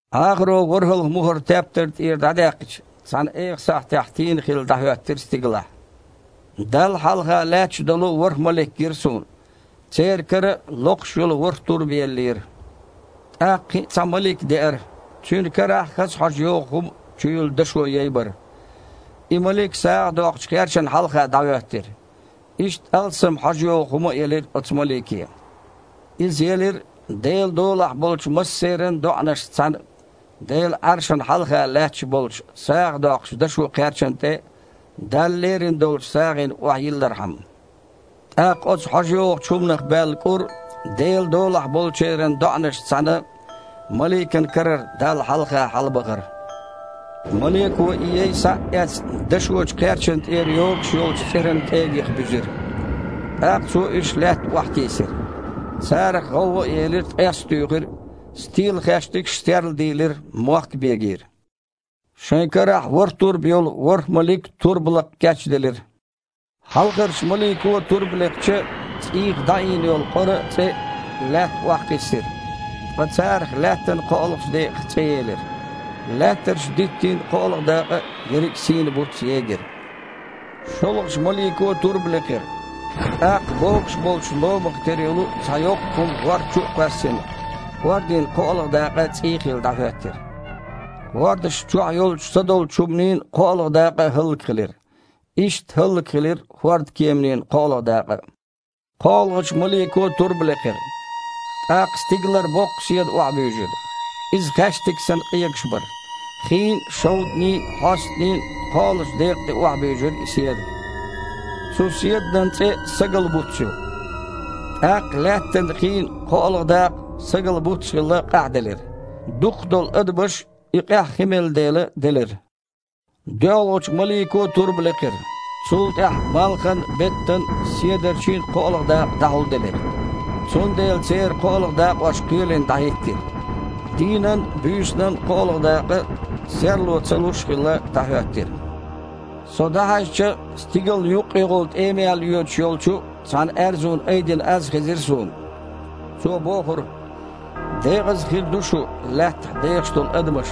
Іахаро ворхІалгІа мухІар тептар тІера дІадаьккхича, цхьана эха сахьтехь тийна хилла дІахІоьттира стигалахь. Далла хьалха лаьтташ долу ворхІ малик гира суна. Церан кара локхуш йолу ворхІ турба еллера. ТІаккха кхин а цхьа малик деара. Цуьнан карахь хаза хьожа йогІу хІума чуюьллу дашо яй бара. И малик сагІа доккхучу кхерчана хьалха дІахІоьттира. Иштта алссам хьожа йогІу хІума а елира оцу малике. Иза елира, Делан долахь болчу массеран а доІанашца цхьаьна, Делан Іаршана хьалха лаьтташ болчу сагІа доккхучу дашо кхерчана тІе Далла лерина долчу сагІина охьайиллархьама. ТІаккха оцу хьожа йогІучу хІуманах баьлла кІур Делан долахь болчеран доІанашца цхьаьна маликан карара Далла хьалха хьалабахара. Малико и яй, схьа а эцна, дашочу кхерчана тІера йогуш йолчу цІеран кІегийх буьзира. ТІаккха цо уьш лаьтта охьатийсира. Царах гІовгІа а елира, ткъес а туьйхира, стелахаьштигаш а серладийлира, мохк а бегийра. Шайн карахь ворхІ турба йолу ворхІ малик турба лакха кечделира. Хьалхарчу малико турба лекхча, цІийх дІаийна йолу къора а, цІе а Лаьтта охьакхиссира, ткъа царах Лаьттан кхоалгІачу декъах цІе елира. Лаьттарчу диттийн кхоалгІа дакъа а, ерриг а сийна буц а егира. ШолгІачу малико а турба лекхира. ТІаккха, богуш болчу ломах тера йолу цхьа йоккха хІума хІорда чу а кхоьссина, хІордийн кхоалгІа дакъа цІий хилла дІахІоьттира. ХІордашна чохь йолчу садолчу хІуманийн кхоалгІа дакъа а хІаллакьхилира. Иштта хІаллакьхилира хІордкеманийн кхоалгІа дакъа а. КхоалгІачу малико а турба лекхира. ТІаккха стигалара боккха седа охьабуьйжира. Иза, хаьштиг санна, къегаш бара. Хийн а, шовданийн а, хьостанийн а кхоалгІачу декъа тІе охьабуьйжира и седа. Цу седанан цІе «сагал-буц» ю. ТІаккха Лаьттан хийн кхоалгІа дакъа, сагал-буц а хилла, къахьделира. Дукхахдолу адамаш, и къаьхьа хи мелла дела, делира. ДоьалгІачу малико а турба лекхира. Цул тІаьхьа малхан а, беттан а, седарчийн а кхоалгІа дакъа дІахьулделира. Цундела церан кхоалгІа дакъош кхоьлина дІахІиттира. Дийнан а, буьйсанан а кхоалгІа дакъа, серло ца луш а хилла, дІахІоьттира. Со дІахьаьжча, стигална юккъехула тІемаяьлла йоьдуш йолчу цхьана аьрзун айдина аз хезира суна. Цо бохура: «Декъаза хир ду шу, лаьттахь дехаш долу адамаш,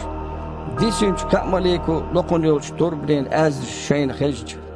дисинчу кхаа малико локхун йолчу турбанийн аьзнаш шайна хезча!»